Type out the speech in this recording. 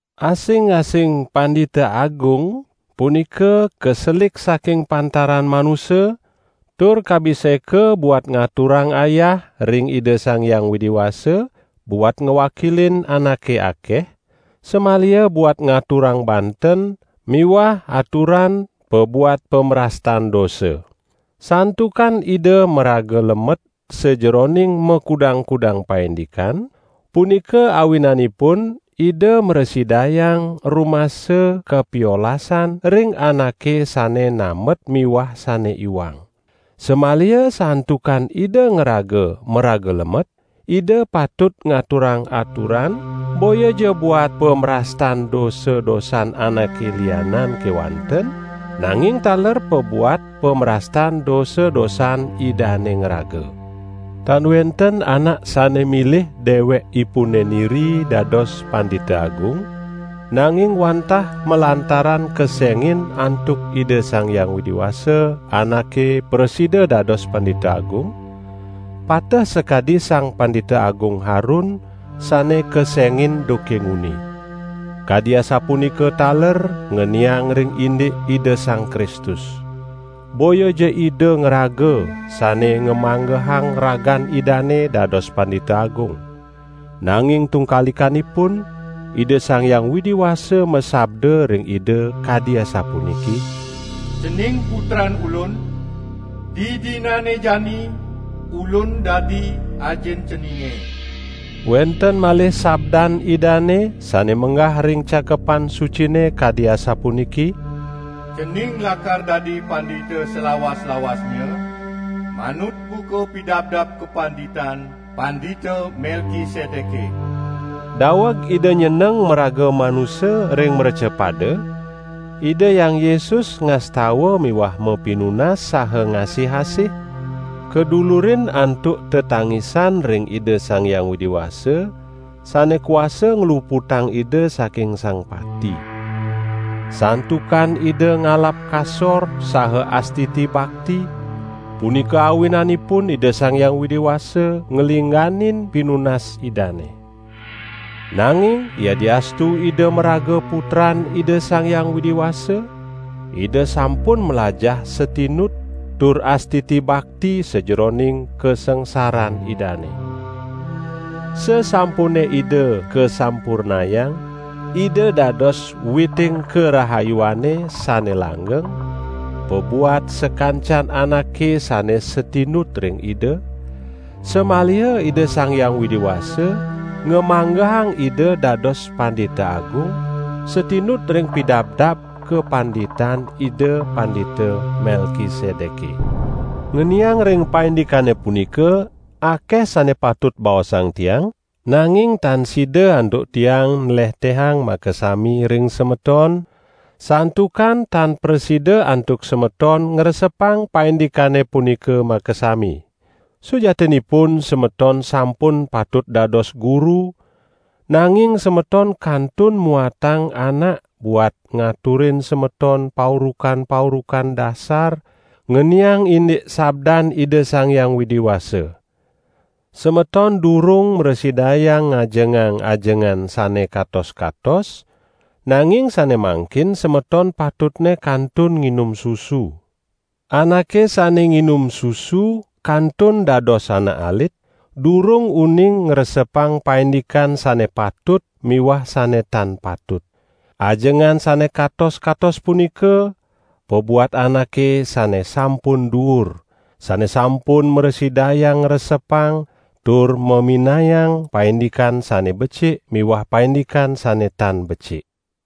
Asing-asing Pandita Agung punika kaselik saking pantaran manusa tur kabiseka buat ngaturang ayah ring Ida Sang Hyang Widi Wasa buat ngwakilin anake akeh, samaliha buat ngaturang banten miwah aturan pabuat pamrastan dosa. Santukan ida maraga lemet sajeroning makudang-kudang paindikan, punika awinanipun Ida mrasidayang rumasa kapiolasan ring anake sane nambet miwah sane iwang. Samaliha santukan ida ngraga maraga lemet, ida patut ngaturang aturan boyaja buat pamrastan dosa-dosan anake lianan kewanten, nanging taler pabuat pamrastan dosa-dosan idane ngraga. Tan wenten anak sane milih dewekipune niri dados Pandita Agung, nanging wantah malantaran kesengin antuk Ida Sang Hyang Widi Wasa anake prasida dados Pandita Agung, pateh sakadi Sang Pandita Agung Harun sane kesengin duke nguni. Kadi asapunika taler ngeniang ring indik Ida Sang Kristus. Boyaja Ida ngraga sane ngamanggehang ragan Idane dados Pandita Agung. Nanging tungkalikanipun, Ida Sang Hyang Widi Wasa masabda ring Ida kadi asapuniki: "Cening Putran Ulun; didinane jani Ulun dadi Ajin Ceninge!" Wenten malih sabdan Idane, sane menggah ring Cakepan Sucine kadi asapuniki: "Cening lakar dadi Pandita salawas-lawasnya manut buka pidabdab kapanditan Pandita Melkisedeke." Daweg Ida nyeneng maraga manusa ring mrecapada, Ida Hyang Yesus ngastawa miwah mapinunas saha ngasih-asih kadulurin antuk tetangisan ring Ida Sang Hyang Widi Wasa sane kuasa ngluputang Ida saking sang pati. Santukan Ida ngalap kasor saha astiti bakti, punika awinanipun Ida Sang Hyang Widi Wasa nglingganin pinunas Idane. Nanging yadiastu Ida maraga Putran Ida Sang Hyang Widi Wasa, Ida sampun mlajah satinut tur astiti bakti sajeroning kasangsaran Idane. Sasampune Ida kasampurnayang Ida dados witing karahayuane sane langgeng pabuat sakancan anake sane satinut ring Ida, samaliha Ida Sang Hyang Widi Wasa ngamanggehang Ida dados Pandita Agung satinut ring pidabdab kapanditan Ida Pandita Melkisedeke. Ngeniang ring paindikane punika, akeh sane patut baosang tiang, nanging tan sida antuk tiang nlehtehang makasami ring semeton, santukan tan prasida antuk semeton ngresepang paindikane punika makasami. Sujatinipun semeton sampun patut dados guru, nanging semeton kantun muatang anak buat ngaturin semeton paurukan-paurukan dasar, ngeniang indik sabdan Ida Sang Hyang Widi Wasa. Semeton durung mrasidayang ngajengang ajengan sane katos-katos, nanging sane mangkin semeton patutne kantun nginum susu. Anake sane nginum susu kantun dados anak alit, durung uning ngresepang paindikan sane patut miwah sane tan patut. Ajengan sane katos-katos punika pabuat anake sane sampun duur, sane sampun mrasidayang ngresepang tur maminayang paindikan sane becik miwah paindikan sane tan becik.